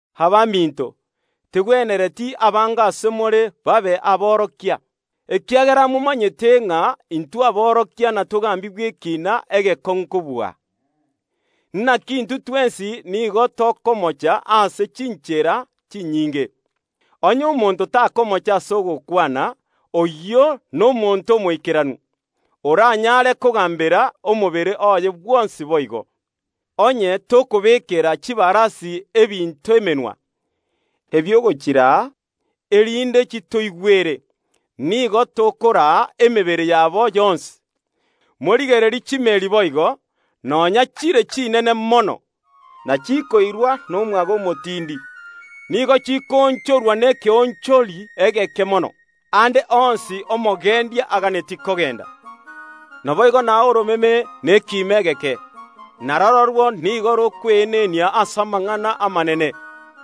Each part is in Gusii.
Abaminto, tegwenereti abange ase more babe aborokia, ekiagera momanyete ng’a intwe aborokia inatogambigwe ekiina egekong’u kobua. Naki intwe twensi nigo tokomocha ase chinchera chinyinge. Onye omonto takomocha ase ogokwana, oyio nomonto omoikeranu, oranyare kogambera omobere oye bwonsi boigo. Onye tokobekera chibarasi ebinto emenwa, ebi’ogochiraa, erinde chitoigwere, nigo tokoraa emebere yabo yonsi. Morigererie chimeeri boigo, nonya chire chinene mono, na chikoirwa nomwaga omotindi, nigo chikoonchorwa nekeonchori egeke mono, aande onsi omogendia aganetie kogenda. Naboigo na oromeme nekiimo egeke, na rororwo nigo rokweenenia ase amang’ana amanene.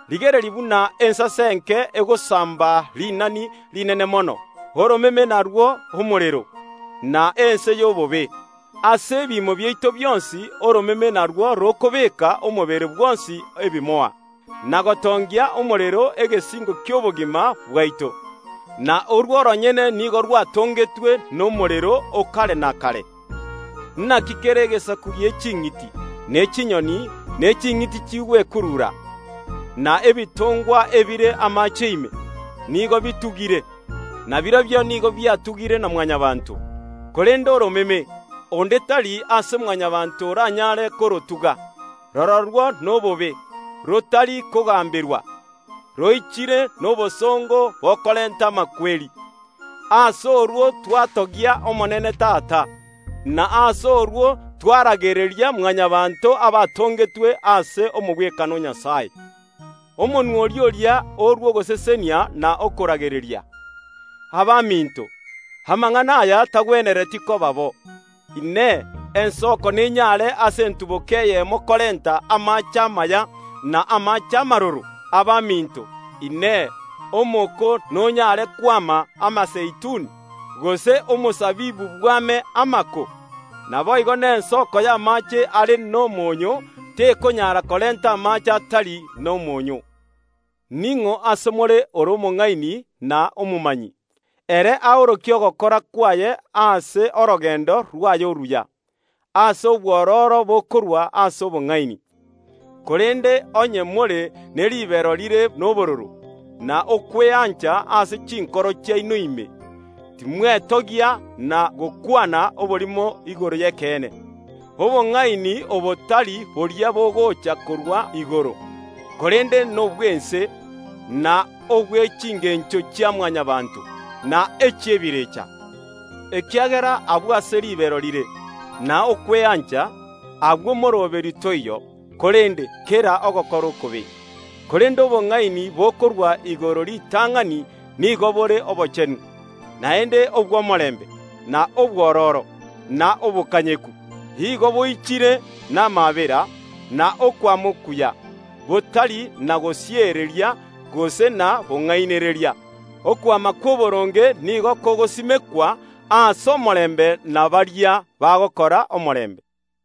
Rigereria buna ensase enke egosamba rinani rinene mono. Oromeme narwo omorero, na ense y’obobe. Ase ebiimo biaito bionsi oromeme narwo rokobeeka omobere bwonsi ebimoa, na gotongia omorero egesingo ki’obogima bwaito, na orwo oronyene nigo rwatongetwe nomorero o kare na kare. Naki kera egesaku gie ching’iti, ne chinyoni, ne ching’iti chigwekurura, na ebitongwa ebire amaache ime, nigo bitugire, na birobio nigo bitugire na Mwanyabaanto. Korende oromeme, onde tari ase Mwanyabaanto oranyare korotuga. Rororwo nobobe, rotari kogamberwa, roichire nobosongo bokorenta amakweri. Ase orwo twatogia Omonene Tata, na ase orwo twaragereria Mwanyabaanto abatongetwe ase omogwekano o Nyasae. Omonwa oria oria orua ogosesenia na okoragereria. Abaminto, amang’ana aya tagwenereti koba bo. Inee! Ensoko nenyare ase entuboka eyemo korenta amaache amaya, na amaache amaroro? Abaminto, Inee, omoko nonyare kwama amazeituni, gose omosabibu bwame amako? Naboigo nensoko y’amaache are n’omonyoo tekonyara korenta amaache atari nomoonyo. Mbarabi ase more bare nobong’aini na obomanyi? Barobwo baorokie ogokora kwabo ase orogendo rwabo oruya, ase obwororo bokorwa ase obong’aini. Korende onye more ne ribero rire nobororo, na okweancha ase chinkoro chiaino ime, timwetogia na gokwana oborimo igoro y’ekeene. Obong’aini obo tari boria bogocha korwa igoro, korende nobw’ense, na obwe chingencho chia Mwanyabaanto, na saitani, ekiagera agwo ase ribero rire, na okweancha, agwo moroberio toiyo, korende kera ogokora okobe. Korende obong’aini bokorwa igoro ritang’ani nigo bore obochenu, naende obw’omorembe, na obwororo, na obokanyeku. Igo boichire namaabera na okwama okuya, botari na gosiereria gose na bong’ainereria. Okwama kw’oboronge nigo kogosimekwa ase omorembe na baria bagokora omorembe.